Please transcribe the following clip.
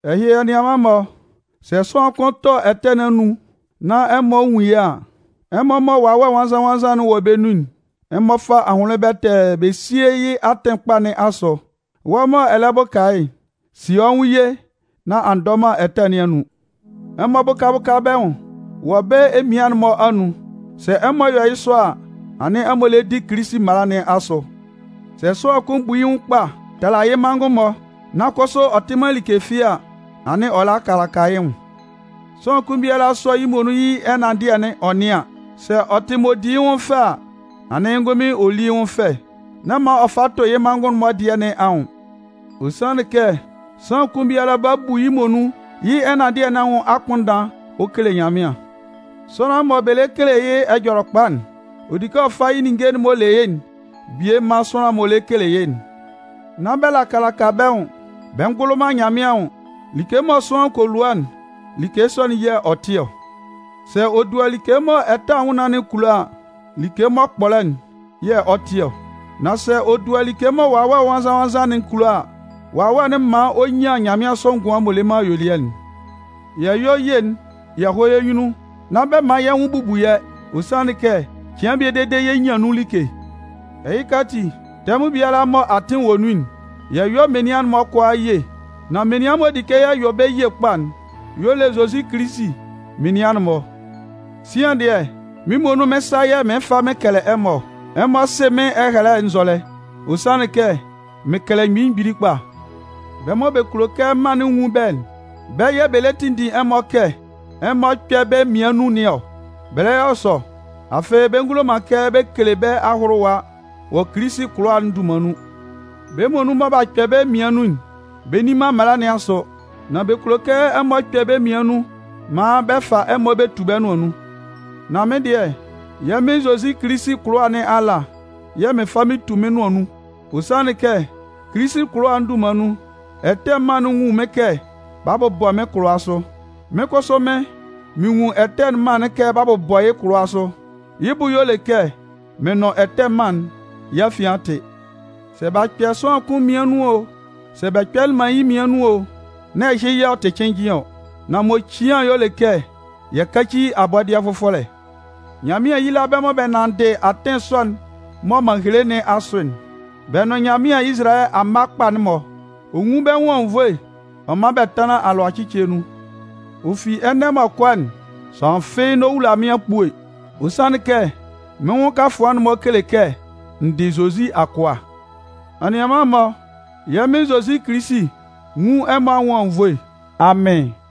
Ɛhɩ, anianman-mɔ, sɛ sʋanlan kʋn tɔ ɛtɛ nɩn anun nán ɛmɔ nwun yɩ́ a, ɛmɔ mɔ Wawɛ Nwannzan-nwannzan'n wɔ bɛ́ nun'n, ɛmɔ fá ahʋnlɩn bɛtɛɛ bɛ síe yɩ́ atɩn kpa nɩn asʋ. Wɔ́ mɔ ɛ lɛ bʋka yɩ́'n, síe wɔ́ nwʋn ye nán a ndɔ man ɛtɛ nɩn anun. Ɛmɔ bʋ́ka bʋ́ka bɛ́ nwʋn wɔ bɛ́ emian'n-mɔ anun. Sɛ ɛmɔ yɔ yɩ́ sɔ a, anɩn ɛmɔ lɛ di Kilisi mala nɩn asʋ. Sɛ sʋanlan kʋn bu yɩ́ nwʋn kpa tala yɩ́ manngʋn-mɔ, nan kʋsʋ ɔ tɩ man like fɩ́ɩ́ a, anɩn ɔ lɛ laka laka yɩ́ nwʋn. Sʋanlan kʋn biala sɔ́ yɩ́ muonun yɩ́ ɛnanndɩɛ'n ɔ nɩ́an. Sɛ ɔ tɩ m'ɔ di yɩ́ nwʋn fɛ a, anɩn yɩ́ ngʋnmɩn ɔ lí yɩ́ nwʋn fɛ, nán man ɔ fa tʋ yɩ́ manngʋn'n-mɔ dɩɛ nɩn anwʋn. Ɔ sanlɩn kɛ sʋanlan kʋn biala 'ba bu yɩ́ muonun yɩ́ ɛnanndɩɛ nɩn anwʋn akpʋnndan ɔ kele Nyanmɩan. Sʋanlan mɔ bɛ lɛ kele yɩ́ Ɛjɔlɛkpa'n, ɔ di kɛ ɔ fa yɩ́ ninnge'n m'ɔ le yɩ́'n bie man sʋanlan'n m'ɔ lɛ kele yɩ́'n. Nán bɛ laka laka bɛ́ nwʋn, bɛ ngʋlʋ man Nyanmɩan anwʋn. Like mɔ sʋanlan kɔ lua'n, like sɔ'n yɛ̂ ɔ 'tɩ ɔ. Sɛ ɔ dua like mɔ ɛtɛ anwʋnnaan'n kulo a, like m'ɔ kpɔlɔ'n yɛ̂ ɔ 'tɩ ɔ. Nan sɛ ɔ dua like mɔ Wawɛ Nwannzan-nwannzan'n kulo a, Wawɛ'n 'man ɔ nyan nyanmɩansʋ ngʋan m'ɔ le man ayuelɩɛ'n. Yɛ yɔ́ ye'n yɛ hɔ́ yɛ́ nyunnun, nán bɛ man yɛ́ nwʋn bubu yɛ́. Ɔ sanlɩn kɛ cɩan bie dede yɛ 'nyan nun like. Ɛhɩka ati, tɛmʋn biala mɔ atɩn wɔ nun'n, yɛ yɔ́ menian'n-mɔ kʋalaa ye. Nan menian m'ɔ di kɛ yɛ yɔ bɛ́ ye kpa'n y'ɔ le Zozi Kilisi menian'n-mɔ. Sian dɩɛ, mɩ́n muonun mɩ́n sa yɛ̂ mɩɩn fa mɩn kɛlɛ ɛmɔ ɔ. Ɛmɔ sɩ mɩ́n ɛhɛlɛ'n nzɔlɛ. Ɔ sanlɩn kɛ mɩn kɛlɛ mgbili mgbili kpa. Bɛ́ mɔ bɛ kulo kɛ mân'n nwun bɛ́'n, bɛ́ yɛ̂ bɛ lɛ tinndin ɛmɔ kɛ ɛmɔ kpɛ́ bɛ́ mmian nun nɩn ɔ. Bɛ lɛ yɔ sɔ, afɩ bɛ ngulo man kɛ bɛ kele bɛ́ ahʋlʋwa wɔ Kilisi kʋlʋwa'n dunman nun. Bɛ́ muonun mɔ b'a kpɛ bɛ́ mmian nun'n, bɛ nni man mala nɩn asʋ. Nan bɛ kulo kɛ ɛmɔ kpɛ bɛ́ mmian nun maan bɛ fa ɛmɔ bɛ tu bɛ́ nʋan nun. Nan mɩ́n dɩɛ, yɛ́ Mɩn Zozi Kilisi kʋlʋwa nɩn ala yɛ̂ mɩn fa mɩn tu mɩ́n nʋan nun. Ɔ sanlɩn kɛ Kilisi kʋlʋwa'n dunman nun, ɛtɛ mân'n nwun mɩ́n kɛ b'a bʋbɔ mɩ́n kʋlʋwa sʋ. Mɩ́n kʋsʋ mɩ́n, mɩn nwun ɛtɛ mân'n kɛ b'a bʋbɔ yɩ́ kʋlʋwa sʋ. Yɩ́ bʋ y'ɔ le kɛ mɩn nʋn ɛtɛ mân'n yɛ́ afian a tɩ. Sɛ b'a kpɛ sʋanlan kʋn mmian nun o, sɛ bɛ kpɛlɩ man yɩ́ mmian nun o, nán ɛhɩ yɛ̂ ɔ tɩ cɩnnjɩn ɔ. Nan m'ɔ cian'n y'ɔ le kɛ yɛ káci abɔdɩɛ fʋfɔlɛ. Nyanmɩan yíla bɛ́ mɔ bɛ 'nanndɩ atɩn sɔ'n mɔ m'an hele nɩn asʋ'n, bɛ nʋn Nyanmɩan Izalayɛ amma kpa'n-mɔ. Ɔ nwún bɛ́ nwʋn anwunnvoe ɔ mán bɛ́ tánlan alʋacɩcɩɛ nun. Ɔ fi ɛnɛ m'ɔ kɔ'n, sʋanlan fɩ́ɩ́ n'ɔ wula mɩ́n akpue. Ɔ sanlɩn kɛ mɩ́n nwʋn kafʋan'n-mɔ kele kɛ n dɩ Zozi akʋa. Anianman-mɔ, yɛ́ Mɩn Zozi Kilisi nwún ɛmɔ anwʋn anwunnvoe. Amɩn!